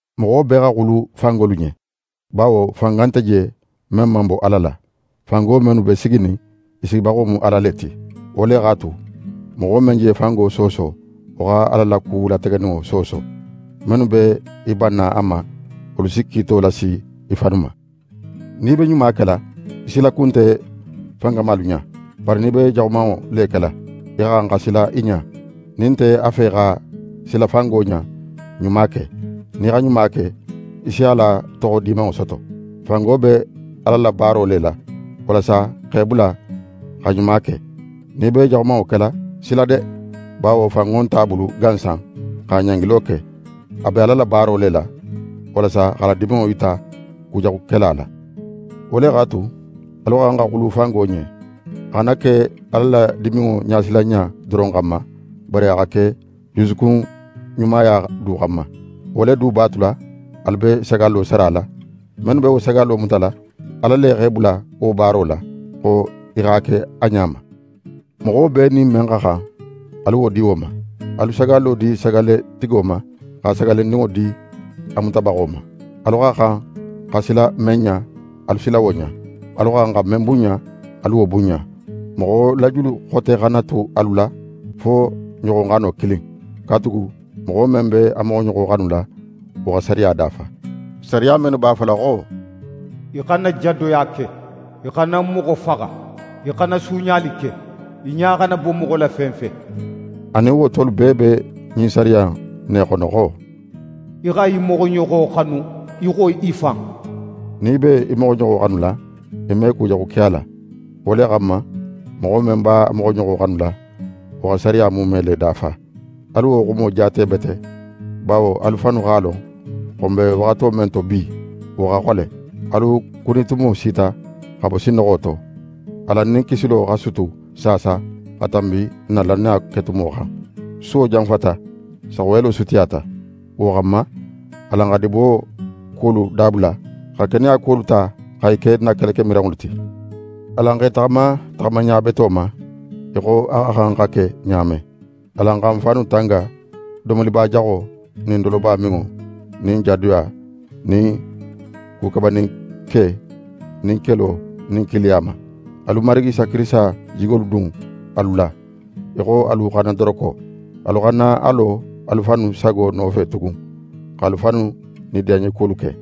Moxo bee xa xulu fangolu ɲen, bawo fanga nte je men man bo Ala la. Fango mennu be siginin, i sigibaxo mu Ala le ti. Wo le x'a tu, moxo men je fango sooso, wo xa Ala la ku lategeninŋo sooso. Mennu be i banna a ma, wolu si kiito lasi i fannu ma. Nin í be ɲuma kela, í silaku nte fankamalu ɲa, bari nin í be jaxumanŋo le kela, í xa xan xa sila i ɲa. Nin í nte a fe xa sila fango ɲa, ɲuma ke. Nin í xa ɲuma ke, í si a la toxo dimanŋo soto. Fango be Ala la baaro le la, walasa a x'é bula xa ɲuma ke. Nin í be jaxumanŋo kela, sila de; bawo fanŋo nt'a bulu gansan xa ɲangilo ke: A be Ala la baaro le la, walasa x'a la diminŋo yita kujaxukela la. Wo le x'a tu, alu xa xan xa xulu fango ɲen. A xana ke Ala la diminŋo ɲasilanɲa doron xanma, bari a xa ke jusukunɲumaya du xanma. Wo le du b'a tula, alu be sagallo sarala. Mennu be wo sagallo mutala, Ala le x'e bula wo baaro la, xo i x'a ke a ɲa ma. Moxo bee nin men xa xan, alu wo di wo ma. Alu sagallo di sagalletigo ma, xa sagallendinŋo di a mutabaxo ma. Alu xa xan xa sila men ɲa, alu sila wo ɲa. Alu xa xan xa men bunɲa, alu wo bunɲa. Moxo la julu xote xana ke alu la fo ɲoxoxano kilin. Katugu moxo men be a moxoɲoxo xanula, wo xa sariya dafa. Sariya mennu b'a fola xo: «Í xana jadoya ke, í xana moxo faxa, í xana suuɲali ke, í ɲa xana bo moxo la fen fe.» Anin wo tolu bee be ɲin sariya in ne xono xo: «Í xa í moxoɲoxo xanu í xo í fan.» Nin í b'é moxoɲoxo xanula, í me ku jaxu ke a la. Wo le xanma, moxo men b'a moxoɲoxo xanula, wo xa sariya muume le dafa. Alu wo xumo jaate bete, bawo alu fannu x'a lon xo n be waxato men to bi, wo xa xole: Alu kunitumo sita xa bo sinnoxo to. Alan nin kisilo xa sutu saasa xa tanbi n na lannaya ketumo xan. Suwo janfayata, saxuyelo sutiyata. Wo xanma, alan xa dibo kuwolu dabula, xa keneya kuwolu ta xa i ke n na kelekemiranŋolu ti. Alan x'e taxama taxamaɲa beto ma, í xo a xa xan xa ke ɲa men. Alan xa n fannu tanga domolibajaxo nin dolobaminŋo nin jadoya nin ku kabaninke nin kelo nin kiiliya ma. Alu Marigi Isa Kirisita jigolu dun alu la, í xo alu xannadoroko. Alu xana a lo alu fannu sago nofe tugun, x'alu fannu nidiyanɲekuwolu ke.